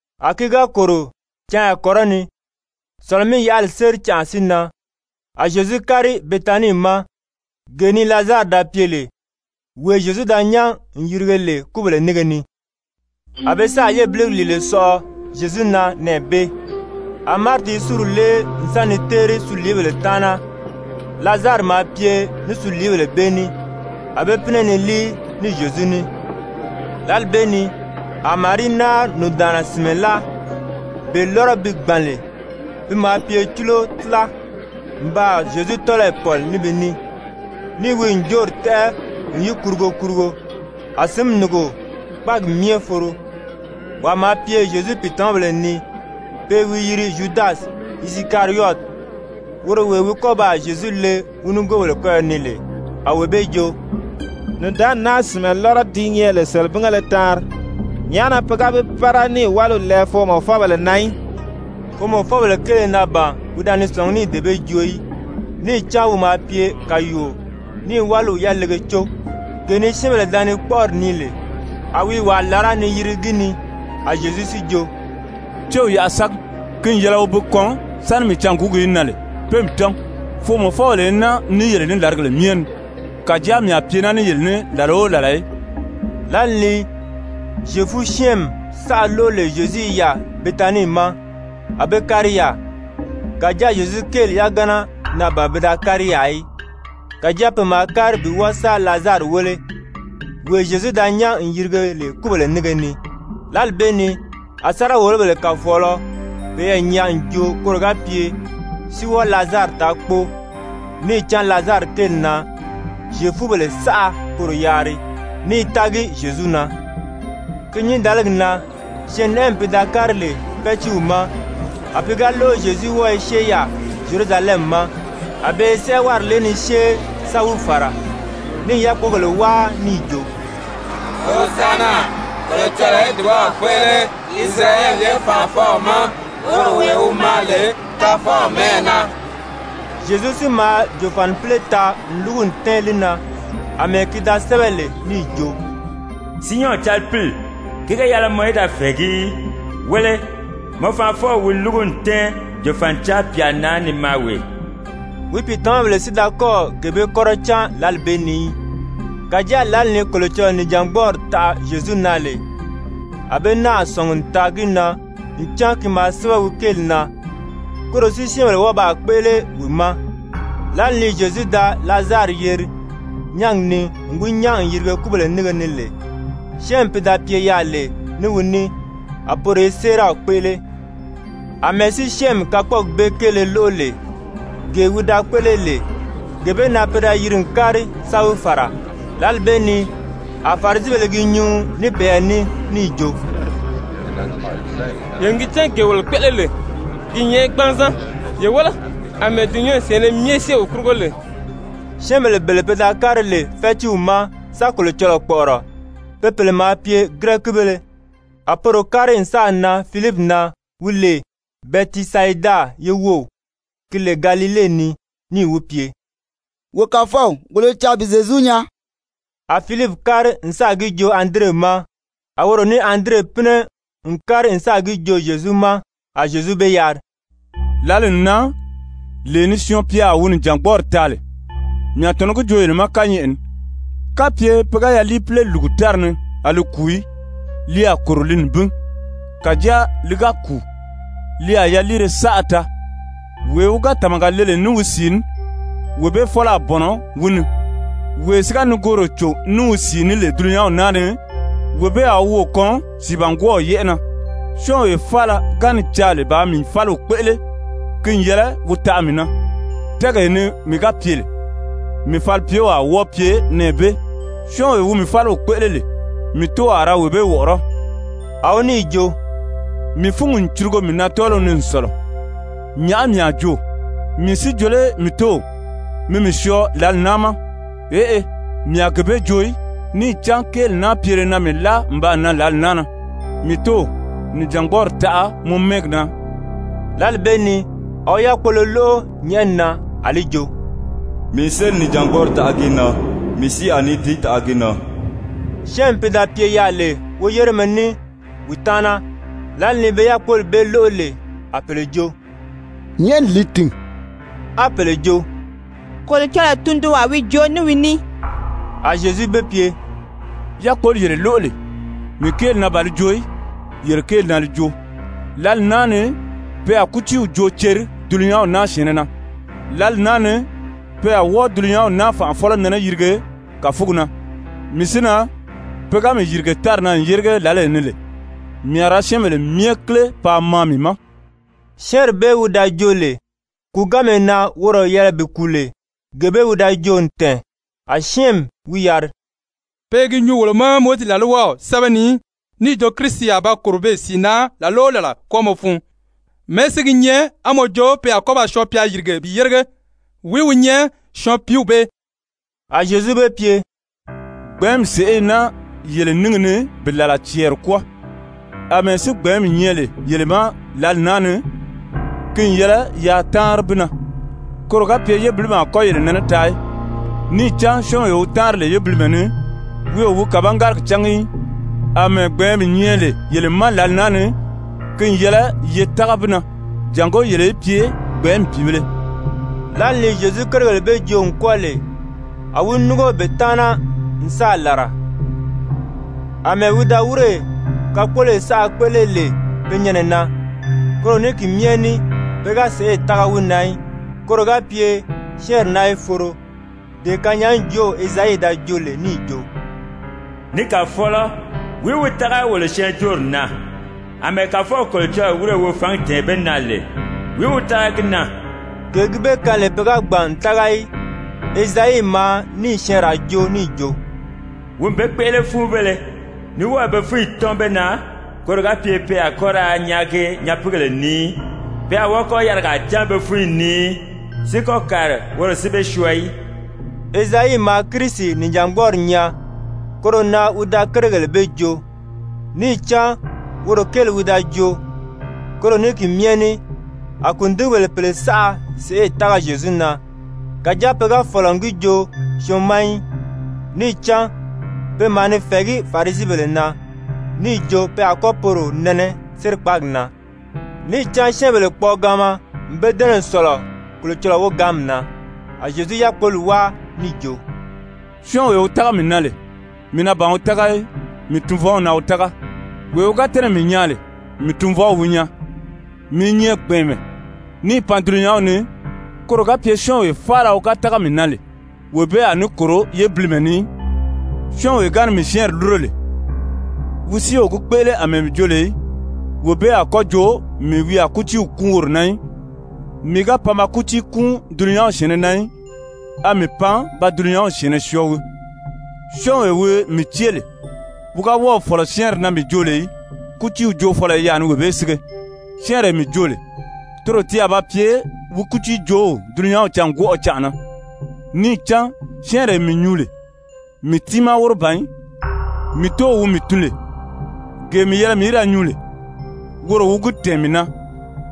A ki ga kòro canya kɔrɔni, Sɔ̀lɔ-mí-yaʔali séri canʔa si nan, a Zyezu kári Betanii ma, gee ni Lazari da pye lè, wee Zyezu da nyán n yirige lè kúbèle nínge ni. A be sáà yébiligi lìile sɔʔɔ Zyezu na nɛɛ bee. A Mariti i súri lée n sa ni téeri suliibèle taana, Lazari maa pye ní suliibèle bee ní, a be pínɛ ni líi ní Zyezu ní. Lǎli bee ni a Marii náari nùndaanna sìnmɛ láa, bee lɔ́rɔ ti gbàn lè, pi maa pye cúlo tíla, n baa Zyezu tɔ́lɔyi pɔ̀li ní bi ní, níì wi ǹjoori tɛ́ʔɛ n yi kurugo kurugo. A sǐnmi núngo kpáagi myɛ foro. Wàa maa pye Zyezu pìitamabèle ni, pe i wi yiri Zyudasi Isikariyɔti, woro wee wi a kɔ́ ba wi le nigoobèle kɔ́yɔ ni lè, a wee bee jo: «Nùndaanni naa sìnmɛ lɔ́rɔ di nyɛ lè selebingéle taanri, nyàʔá na pe ga bi pára níì wáliw lɛɛ foomɔfɔbèle na í?» Foomɔfɔbèle kéele na ban wi da ni sɔ̀ngí níì dee bee joo í, níì cán wi maa pye kàyuuo ní i wáliw yalege có, gee ni syɛ́ɛnbèle da ni kpɔ́ʔɔri nii lè, a wi i wàa làrá ni yirigi gi ni. A Zyezu si jo: «Céw yaʔa sági. Ki n yɛlɛ wi bi kɔn sáni mii cânguugi í nan lè pé mii tɔ́n. Foomɔfɔbèle i naa ní yele ní làrigèle myɛ ni, kàjáa mii a pye naa ní yele ní làla o làla í.» Lǎli ni Zyefu-syɛ́ɛnmi saʔa lóʔo lè Zyezu i yaà Betanii ma, a be kári yaà. Kàjáa Zyezu kéeli yagana na ban pe da kári yaà í, kàjáa pe maa kári bi wɔ́ɔ sa Lazari wéle, wee Zyezu da nyán n yirige lè kúbèle nínge ni. Lǎli bee ni a sáriga-wòlobèle kàfɔɔlɔ peyɛɛ nyaa n joo koro ga pye si wɔ́ɔ Lazari taa kpóo, níì cán Lazari kéeli na Zyefubèle saʔa poro yaari, ní i tági Zyezu na. Ki nyǐndaligi na syɛɛnnɛʔɛmi pi da kári lè fɛ́tiiw ma, a pi ga lóʔo Zyezu wɔ́ɔ i syée yaà Zyerusalɛmi ma, a be i sɛ́ʔɛwari lée ni syée sa wi fàra, ní i yákpogèle wáa níì jo: «Hozanna! Kolocɔlɔɔ í dùbaw kpéʔele Isirayɛli ye fànʔafɔw ma, woro wee wi maa lè Kàfɔw mɛ́ʔɛ na.» Zyezu si maa jòfanipile taa n lúgu n tɛ́ɛn li na, àmɛɛ ki da sɛ́bɛ lè níì jo: «Siyɔn calipili, ki ga yɛlɛ mɔ í da fɛ̀ɛgí í. Wéle, mɔ fanʔafɔw wi lúgu n tɛ́ɛn jòfanicaa pyà na ni maa wee.» Wi pìitamabèle si da kɔ́ɔ̀ gee bee kɔ́rɔ cán lǎli bee ni í. Kàjáa lǎli ni Kolocɔlɔɔ nìjangbɔɔri taʔa Zyezu na lè, a be náà sɔ̀ngi n taa gi na ncan ki maa sɛ́bɛ wi kéeli na, koro si syɛ́ɛnbèle wɔ́ɔ baa kpéʔele wi ma. Lǎli ni Zyezu da Lazari yeri nyángi ni n wi nyán n yirige kúbèle nínge ni lè, syɛ́ɛnmi pi da pye yaà lè ní wi ní, a poro i séeraw kpéʔele. Amɛɛ si syɛ́ɛnmi kakpɔɔgi bee kéele lóʔo lè, gee wi da kpéʔele lè, gee bee na pe da yiri n kári sa wi fàra. Lǎli bee ni a Farisibèle i gi nyuu ní peyɛɛ ní níì jo: «Yele n gi cán gee wolo kpéʔele lè, ki i nyɛ gbanzan, ye wéle, àmɛɛ dulunyanw syɛ̀ɛnnɛ myɛ syée wi kurugo lè.» Syɛ́ɛnbèle bele pe da kári lè fɛ́tiiw ma sa Kolocɔlɔɔ kpɔ̀ʔɔrɔ, be pèle maa pye Girɛkibéle. A poro kári n sáà nan Filipi na wi lè Bɛtisayida ye wów, ki lè Galile ni, níì wi pye: «Wo kàfɔw, wolo i caa bi Zyezu nyaa.» A Filipi kári n sáà gi joo Andire ma, a woro ní Andire pínɛ n kári n sáà gi joo Zyezu ma. A Zyezu be yari: «Lǎli n nan, lee ni Syɔɔn-pya a wi nìjangbɔɔri taa lè. Mii a tɔ̀nɔ́ gi joo yele ma kányɛʔɛ ni, kapye pe ga yaliipile lùgu tári ni a li kùu í, li a kòro li nibin. Kàjáa li ga kùu, li a yaliire saʔa taa. Wee wi ga tàmaga le lè ní wi sìi ní, wee bee fɔ́lɔ a bɔ̀nɔ wi ni, wee si ga nigooro cò ní wi sìi ní lè dulunyanw naa ni, wee bee a wi woò kɔn sìibangwɔɔw yɛ́ʔɛ na. Syɔ́ɔnwee faala ga ni caa lè bàā mii fáliw kpéʔele, ki n yɛlɛ wi taʔa mii na, tɛ́ɛgee ni mii ga pye lè, mii falipyew a wɔ́ɔ pye nɛɛ bee. Syɔ́ɔnwee wi mii fáliw kpéʔele lè, mii Tóow a ra wee bee wɔ̀ʔɔrɔ́.» A wi níì jo: «Mii fúngi n curugo mii na tɔ́ɔliw ni n sɔ̀lɔ. Nyàʔá mii a joo? Mii si jo lé, mii Tóow, mi mii syɔɔ lǎli naa ma? Eʔe, mii a gee bee joo í, níì cán kéeli naa pyele na mii láa n baa nan lǎli naa na. Mii Tóow, nìjangbɔɔri taʔa mɔ mɛ́ɛgi na!» Lǎli bee ni a wi yákpolo lóʔo nyɛ̀ʔɛni na, a li jo: «Mii n sélì nìjangbɔɔri taʔa gi na, mii si a ní di taʔa gi na.» Syɛ́ɛnmi pi da pye yaà lè woyéremɛ ní wi taana, lǎli ni be yákpoli bee lóʔo lè, a pèle jo: «Nyɛ̀ʔɛni li tìn,» á pèle jo: «Kolocɔlɔɔ tundunwaa wi joo ní wi ní.» A Zyezu be pye: «Yákpoli yele lóʔo lè, mii kéeli na ban li joo í, yele kéeli na li joo. Lǎli naa ni pe a kútiiw joo ceri dulunyanw naa syɛ̀ɛnnɛ na. Lǎli naa ni pe a wɔ́ɔ dulunyanw naa fànʔafɔlɔ nɛnɛ yirige kàfugi na. Mii si na, pe ga mii yìrige tári na n yérige lǎlee ni lè, mii a ra syɛ́ɛnbèle myɛ kíle paa maa mii ma.» Syɛ́ɛnri bee wi da joo lè, kùuganmee na woro yɛlɛ bi kùu lè, gee bee wi da joo n tɛ̀ɛn. A syɛ́ɛnmi wi yari: «Pe i gi nyuu wolo ma Mowizi làlwaw sɛ́bɛ ni níì jo Kirisi a ba kòro beè sìi na làla o làla kwɔ́ɔmɔ fun. Mɛ̀ɛ́ si gi nyɛ á mɔ jo pe a kɔ́ ba Syɔɔn-pya yìrige bi yérige? Wìí wi nyɛ Syɔɔn-piiw bee?» A Zyezu be pye: «Gbɛ̀ɛ́nmi sèʔé i naa yele níngi ni bi làla cɛɛri kwɔ́ɔ. Amɛɛ si gbɛ̀ɛ́nmi nyɛ lè yele ma lǎli naa ni, ki n yɛlɛ yaa táanri bi na, koro ga pye yébilimi a kɔ́ yele nɛnɛ taa í. Níì cán syɔ́ɔnwee wi táanri lè yébilimɛ ni, wi o wi kàbangárigi cángi í. Amɛɛ gbɛ̀ɛ́nmi nyɛ lè yele ma lǎli naa ni, ki n yɛlɛ ye tága bi na, jàngó yele í pye gbɛ̀ɛ́nmi pìibēle.» Zyefubèle sìndagala kéele Lǎli ni Zyezu kérigèle bee joo n kwɔ́ɔ lè, a wi núngo be taana n sáà làra. Amɛɛ wi da wírè kakpoloyi saʔa kpéʔele lè pe nyɛnɛ na, koro ní ki myɛ ní pe ga sèʔê tága wi na í. Koro ga pye syɛ́ɛnri naa í foro, dee kanyaajoow Ezayi da joo lè níì jo: «Ni Kàfɔlɔ, wìí wi tága wolo syɛɛnjóori na? Amɛɛ Kàfɔw Kolocɔlɔɔ wírè wi fǎngi tɛ̀ɛn be na lè, wìí wi tága gi na?» Gee gi be kaan lè pe ga gbàn n tága í, Ezayi maa níì syɛɛnraa joo níì jo: «Wi n be kpéʔele fúunbéle, ní wɔ́ɔ̀ be fúnyi tɔ́n be na, koro ga pye pe a kɔ́ ra nyaagi nyapiigèle ni í, pe a wɔ́ɔ kɔ́ yarigaa cán be fúnyi ni í, si kɔ́ kàri woro si be syɔɔ í.» Ezayi maa Kirisi nìjangbɔɔri nyaa, koro na wi da kérigèle bee joo, níì cán woro kéeli wi da joo. Koro ní ki myɛ ní a kùndigibèle pèle saʔa sèʔê tága Zyezu na. Kàjáa pe ga fɔ̀lɔ n gi joo syɔɔn ma í, níì cán pe maa ni fɛ̀ɛgí Farisibèle na, níì jo pe a kɔ́ poro nɛnɛ sérikpaagi na. Níì cán syɛ́ɛnbèle kpɔɔgaanma n be dɛ́nɛ n sɔ̀lɔ Kolocɔlɔɔ wogaanmi na. A Zyezu yákpoli wáa níì jo: «Syɔ́ɔnwee wi tága mii na lè, mii na ban wi tága í, mii Tunvɔw na wi tága. Wee wi ga tɛ́nɛ̀ mii nyaa lè, mii Tunvɔw wi nyaa. Mii i nyɛ gbɛ̀ɛnmɛ, níì pan dulunyanw ni, koro ga pye syɔ́ɔnwee faala wi ga tága mii na lè, wee bee a ní kòro yébilimɛ ni í. Syɔ́ɔnwee ga ni mii syɛ́ɛnri lúro lè, wi si o gi kpéʔele àmɛɛ mii jo lè í, wee bee a kɔ́ jo mii wi a kútiiw kúun woro na í. Mii ga pan ba kútii kúun dulunyanw syɛ̀ɛnnɛ na í, a mii pan ba dulunyanw syɛ̀ɛnnɛ syɔɔ wii. Syɔ́ɔnwee wi mii cée lè, wi ga wɔ́ɔ̀ fɔ̀lɔ syɛ́ɛnri na mii joo lè í, kútiiw joofɔlɔ i yaà ni wee bee sige, syɛ́ɛnree mii joo lè, toro ti a ba pye wi kútiijoow dulunyanw cângwɔʔɔ canʔa na. Níì cán syɛ́ɛnree mii nyuu lè, mii tiimaa wóro ban í. Mii Tóow wi mii tun lè, gee mii yɛlɛ mii í da nyuu lè, woro wi gi tɛ̀ɛn mii na,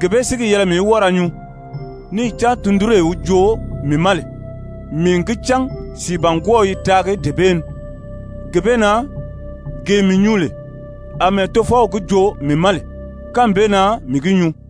gee bee si gi yɛlɛ mii í wɔ́ɔ ra nyuu. Níì cán tundunree wi joo mii ma lè, mii n gi cán sìibangwɔɔw i taagi dee bee ni. Gee bee na gee mii nyuu lè, àmɛɛ Tofɔw gi joo mii ma lè, kánmi bee na mii gi nyuu.»